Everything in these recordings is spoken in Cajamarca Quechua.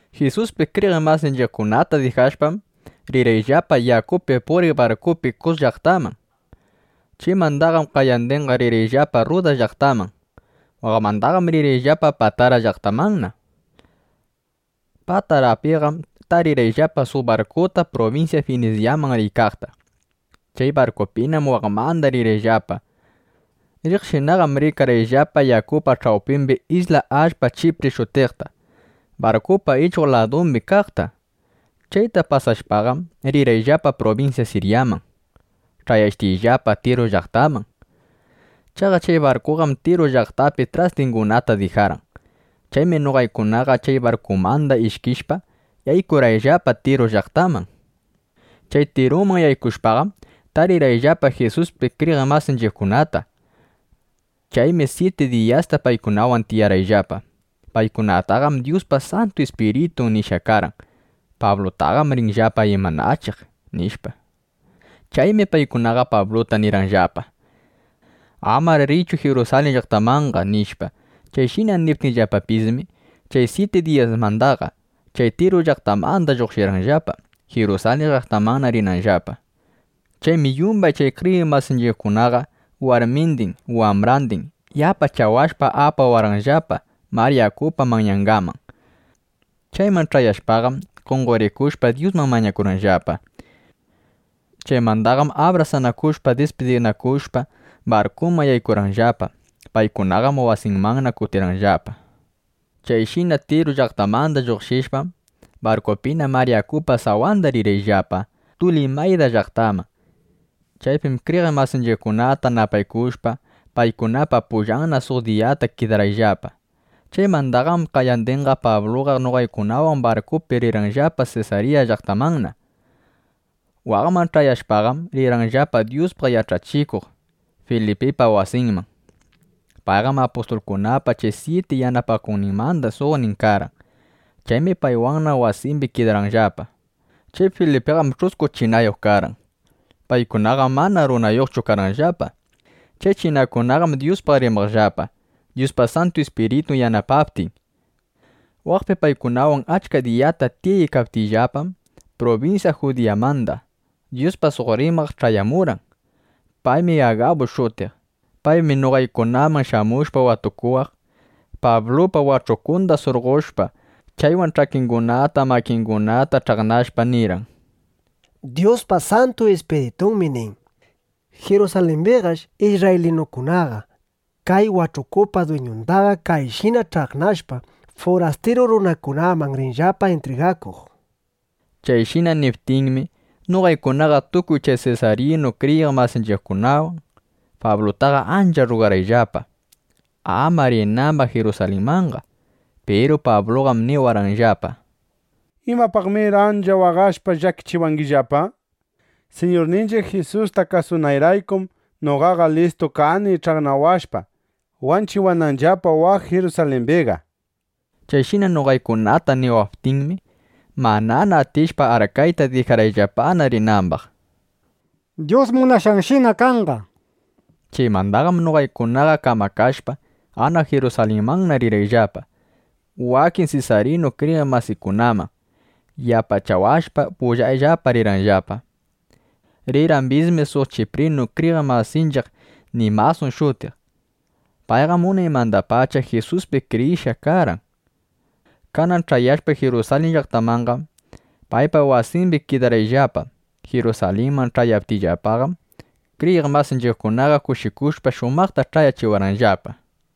Jisuspi kriyiq masinchiqkunata dijashpam, rirqayllapa yakupi puriq barkupi Kus llaqtaman. Chaymandaqam qayandinqa rirqayllapa Rrudas llaqtaman. Waqmandaqam rirqayllapa Patara llaqtamanna. Patarapiqam tarirqayllapa suq barkuta prubinsya Finisyaman riykaqta. Chay barkupinam waqmandaqa rirqayllapa. Riqshinaqam rikarqayllapa yakupa ch'awpimbi isla allpa Chipri shutiqta, barkupa ichuq ladumbi kaqta. Chayta pasashpaqam rirqayllapa prubinsya Siryaman, ch'ayashtiyllapa Tiru llaqtakaman. Chaqa chay barkuqam Tiru llaqtapi trastingunata dijarqan. Chaymi noqaykunaqa chay barkumandaqa ishkishpa, yaykurqayllapa Tiru llaqtaman. Chay Tiruman yaykushpaqam, tarirqayllapa Jisuspi kriyiq masinchiqkunata. Chaymi syiti diyasta paykunawan tiyarqayllapa. Paykunataqam Dyuspa Santu Ispiritun nishqa karqan: Pablutaqam rinllapa imanachiq, nishpa. Chaymi paykunaqa Pabluta nirqanllapa: —Amar riychu Jirusalin llaqtamanqa, nishpa. Chayshina niptinllapapismi, chay syiti diyasmandaqa, chay Tiru llaqtamanda lluqshirqayllapa, Jirusalin llaqtamanna rinayllapa. Chaymi yumbay chay kriyiq masinchiqkunaqa warmindin, wambrandin yapachawashpa apawarqanllapa mar yakupa manyangaman. Chayman ch'ayashpaqam, qonqorikushpa, Dyusman mañakurqayllapa. Chaymandaqam abrasanakushpa, dispidinakushpa, barkuman yaykurqayllapa. Paykunaqam wasinmanna kutirqanllapa. Chayshina Tiru llaqtamanda lluqshishpam, barkupina mar yakupa sawanda rirqayllapa Tulimayda llaqtaman. Chaypim kriyiq masinchiqkunata napaykushpa, paykunapa pullanna suq diyata kidarqayllapa. Chaymandaqam qayandinqa Pabluqa noqaykunawan barkupi rirqayllapa Sesarya llaqtamanna. Waqman ch'ayashpaqam, rirqayllapa Dyuspaq yach'achikuq Filipipa wasinman. Payqam apustulkunapa chay syiti yanapakuqninmanda suqnin karqan. Chaymi paywanna wasimbi kidarqayllapa. Chay Filipiqam ch'usku chinayuq karqan. Paykunaqam mana runayuqchu karqanllapa. Chay chinakunaqam Dyuspaq rimaqllapa, Dyuspa Santu Ispiritun yanapaptin. Waqpi paykunawan achka diyata tiyaykaptiyllapam, prubinsya Judiyamanda Dyuspaq suq rimaq ch'ayamurqan. Paymi Agabu shutiq. Paymi noqaykunaman shamushpa watukuwaq, Pablupa wach'ukunda surqoshpa, chaywan ch'akingunata, makingunata ch'aqnakashpa, nirqan: —Dyuspa Santu Ispiritunmi nin: “Jirusalimbiqash isrraylinukunaqa kay wach'ukupa dwiñundaqa kayshina ch'aqnashpa, furastiru runakunaman rinllapa intrigakuq”, nishpa. Chayshina niptinmi, noqaykunaqa tukuy chay sesaryanu kriyiq masinchiqkunawan Pablutaqa ancha rrugarqayllapa, ama rinambaq Jirusalinmanqa. Piru Pabluqam niwarqanllapa: —¿Imapaqmir ancha waqashpa llakichiwangillapa? Siñurninchiq Jisusta kasunayraykum noqaqa listu kani ch'aqnawashpa, wanchiwananllapa waq Jirusalimbiqa, nishpa. Chayshina noqaykunata niwaptinmi, manana atishpa arkayta, dijarqayllapana rinambaq: —Dyus munashqanshina kanqa, nishpa. Chaymandaqam noqaykunaqa kamakashpa, anaq Jirusalinmanna rirqayllapa. Wakin sesaryanu kriyiq masikunam yapachawashpa, pullayllapa rirqanllapa. Rirqambismi suq chiprinu kriyiq masinchiq Minasun shutiq. Payqam unaymandapacha Jisuspi kriyishqa karqan. Kanan ch'ayashpa Jirusalin llaqtamanqam, paypa wasimbi kidarqayllapa. Jirusalinman ch'ayaptiyllapaqam, kriyiq masinchiqkunaqa kushikushpa, shumaqta ch'ayachiwarqanllapa.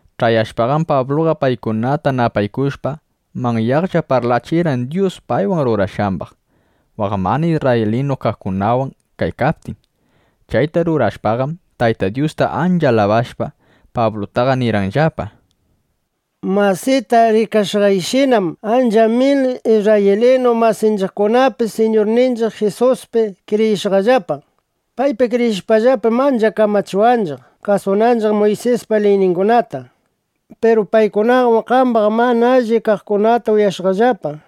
Ch'ayashpaqam Pabluqa paykunata napaykushpa, manyaqlla parlachirqan Dyus paywan rurashqambaq waq mana isrraylinu kaqkunawan kaykaptin. Chayta uyashpaqam, Tayta Dyusta ancha alabashpa, Pablutaqa nirqanllapa: —Masita, rikashqaykishinam, achka mil isrraylinu masinchiqkunapis Siñurninchiq Jisuspi kriyishqallapa. Paypi kriyishpallapam, ancha kamachiwanchiq, kasunanchiq Muysispa liyningunata. Piru paykunaqam qambaq mana allip kaqkunata uyashqallapa: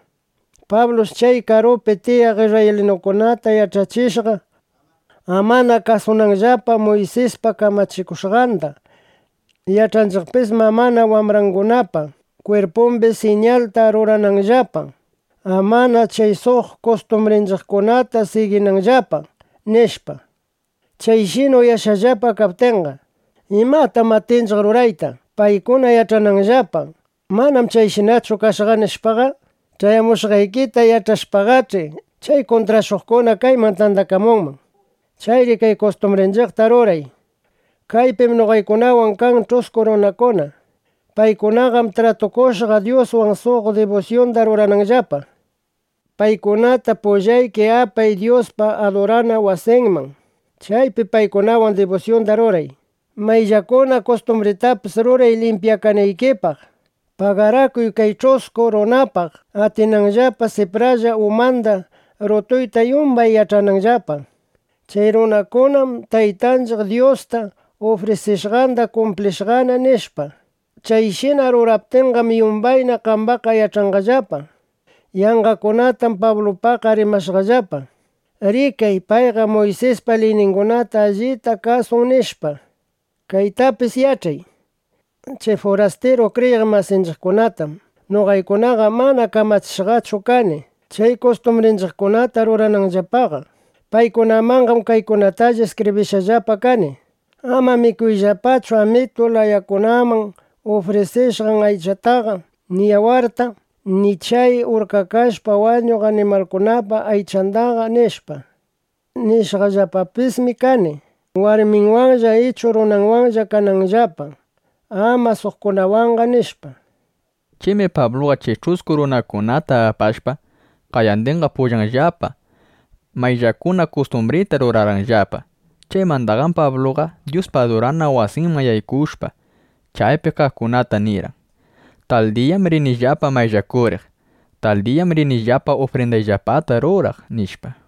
Pablush chay karupi tiyaq isrraylinukunata yach'achishqa, amana kasunanllapa Muysis kamachikushqanda. Yach'achikumbisshi amana wambrangunapa kwirpumbi siñalta ruranambaqllapa, amana chay suq kustumbrinchiqkunata siginanllapa, nishpa. Chayshina uyashqallapa kaptinqa, ¿imatam atinchiq rurayta, paykuna yach'ananllapa: Mana chayshinachu kashqa, nishpaqa? Ch'ayamushqaykita yach'ashpaqach'i, chay kuntrashuqkuna kayman tandakamunman. Chayri kay kustumbrinchiqta ruray. Kaypim noqaykunawan kan ch'usku runakuna. Paykunaqam tratukushqa Dyuswan, suq dibusyunda rurananllapa. Paykunata pullayki apay Dyuspa adurana wasinman. Chaypi paykunawan dibusyunda ruray. Mayllakuna kustumbritapis ruray, limpyakanaykipaq. Pagarakuy kay ch'usku runakunapaq, atinanllapa sipralla umanda rutuyta, yumbay yach'ananllapa: Chay runakunam Taytanchiq Dyusta ufrisishqanda kumplishqana, nishpa. Chayshina ruraptikiqam, yumbayna qambaqqa yach'anqallapa: Yanqakunatam Pablupaqqa rimashqallapa. Rikay, payqa Muysispa liyningunata allita kasun, nishpa. Kaytapis yach'ay: Chay furastiru kriyiq masinchiqkunatam noqaykunaqa mana kamachishqachu kani, chay kustumbrinchiqkunata rurananllapaqa. Paykunamanqam kaykunatalla iskibrishqallapa kani: “Ama mikuyllapachu amitu layakunaman ufrisishqan aychataqa, ni yawarta, ni chay urkakashpa wañuq animalkunapa aychandaqa”, nishpa. Nishqallapapismi kani, warminwanlla ichu runanwanlla kananllapa, ama suqkunawanqa, nishpa. Chaymi Pabluqa chay ch'usku runakunata apashpa, qayandinqa pullanllapa mayllakuna kustumbrita rurarqanllapa. Chaymandaqam Pabluqa Dyuspa adurana wasinman yaykushpa, chaypi kaqkunata nirqan: —Tal diyam rinillapa mayllakuriq. Tal diyam rinillapa ufrindayllapata ruraq, nishpa.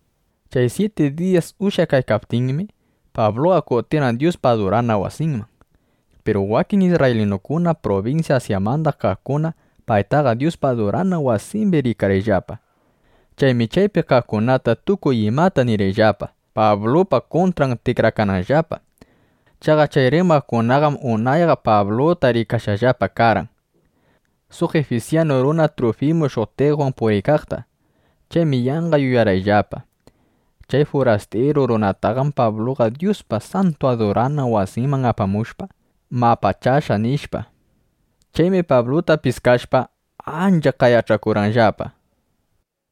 Chay syiti diyas ushyakaykaptinmi, Pabluqa kutirqan Dyuspa adurana wasinman. Piru wakin isrraylinukuna prubinsya Asyamanda kaqkunam paytaqa Dyuspa adurana wasimbi rikarqanllapa. Chaymi chaypi kaqkunata tukuy imata nirqanllapa, Pablupa kuntran tikrakananllapa. Chaqa chay rimaqkunaqam unayqa Pabluta rikashqallapa karqan, suq ifisyanu runa Trufimu shutiqwan puriykaqta. Chaymi yanqa yuyarqanllapa: Chay furastiru runataqam Pabluqa Dyuspa santu adurana wasinman apamushpa, mapachashqa, nishpa. Chaymi Pabluta piskashpa, ancha qayach'akurqanllapa: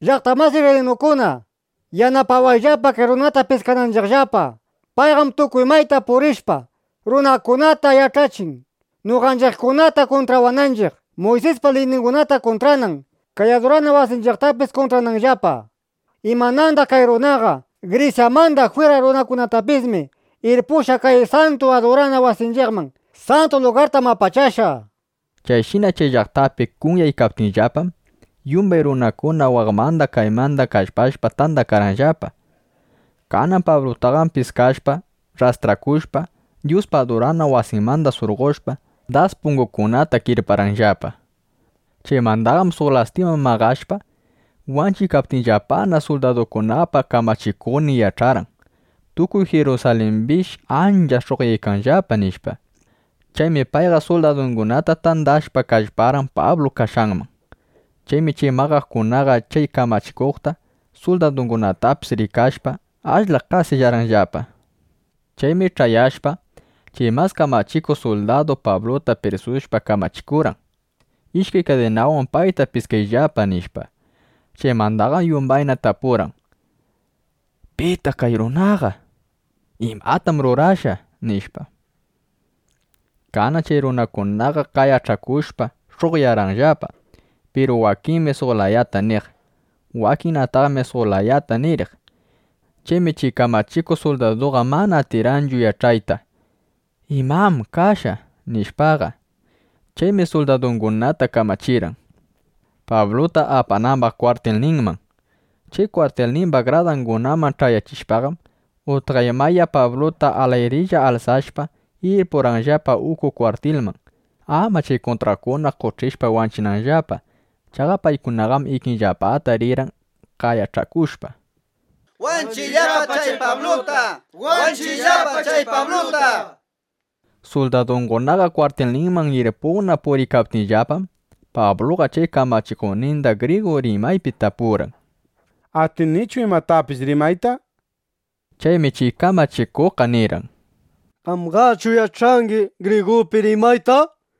—¡Llaqta masi isrraylinukuna! ¡Yanapawayllapa kay runata piskananchiqllapa! ¡Payqam tukuy mayta purishpa, runakunata yach'achin, noqanchiqkunata kuntrawananchiq, Muysispa liyningunata kuntranan, kay adurana wasinchiqtapis kuntrananllapa! ¡Imanandaq kay runaqa Grisyamanda jwira runakunatapismi irpushqa kay santu adurana wasinchiqman! ¡Santu lugartam mapachashqa! nishpa. Chayshina chay llaqtapi kunyaykaptinllapam, yumbay runakuna waqmanda kaymanda kallpashpa, tandakarqanllapa. Kanan Pablutaqam piskashpa, rrastrakushpa, Dyuspa adurana wasinmanda surqoshpa, das pungukunata kirparqanllapa. Chaymandaqam suq lastima maqashpa, wanchiykaptinllapana, suldadukunapa kamachikuqnin yach'arqan: Tukuy Jirusalimbish ancha sh'uqyaykanllapa, nishpa. Chaymi payqa suldadungunata tandashpa, kallparqan Pablu kashqanman. Chaymi chay maqakuqkunaqa chay kamachikuqta, suldadungunatapis rikashpa, ashla qasillarqanllapa. Chaymi ch'ayashpa, chay mas kamachikuq suldadu Pabluta prisushpa, kamachikurqan: —Ishkay kadinawan payta piskayllapa, nishpa. Chaymandaqam yumbayta tapurqan: —¿Pitaq kay runaqa? ¿Imatam rurashqa? nishpa. Kanan chay runakunaqa qayach'akushpa sh'uqyarqanllapa. Piru wakinmi suq layata niq. Wakinnataqmi suq layata niriq. Chaymi chay kamachikuq suldaduqa mana atirqanchu yach'ayta: ¿Imam kashqa? nishpaqa. Chaymi suldadungunata kamachirqan, Pabluta apanambaq kwartilninman. Chay kwartilnimba gradangunaman ch'ayachishpaqam, utqaymaya Pabluta alayrilla alsashpa, irpurqanllapa uku kwartilman, ama chay kuntraqkuna qoch'ishpa wanchinanllapa. Chaqa paykunaqam ikinllapata rirqan qayach'akushpa: —¡Wanchiyllapa chay Pabluta! ¡Wanchiyllapa chay Pabluta! nishpa. Suldadukunaqa kwartilninman irpuqna puriykaptinllapam, Pabluqa chay kamachikuqninda grigu rimaypi tapurqan: —¿Atinichu imatapis rimayta? nishpa. Chaymi chay kamachikuqqa nirqan: —¿Qamqachu yach'angi grigupi rimayta?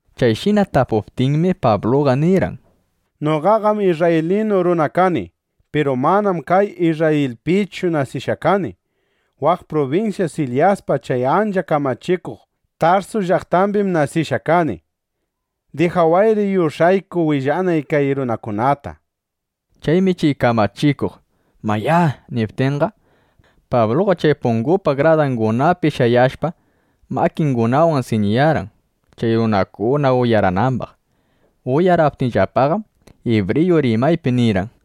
Chayshina tapuptinmi, Pabluqa nirqan: —Noqaqam isrraylinu runa kani. Piru manam kay Isrrayilpichu nasishqa kani. Waq prubinsya Silisyapa chay ancha kamachikuq Tarsu llaqtambim nasishqa kani. Dijawayri yush'ayku willanay kay runakunata, nishpa. Chaymi chay kamachikuq “Mayá” niptinqa, Pabluqa chay pungupa gradangunapi shayashpa, makingunawan siñiyarqan, chay runakuna uyaranambaq. Uyaraptinllapaqam, ibriyu rimaypi nirqan: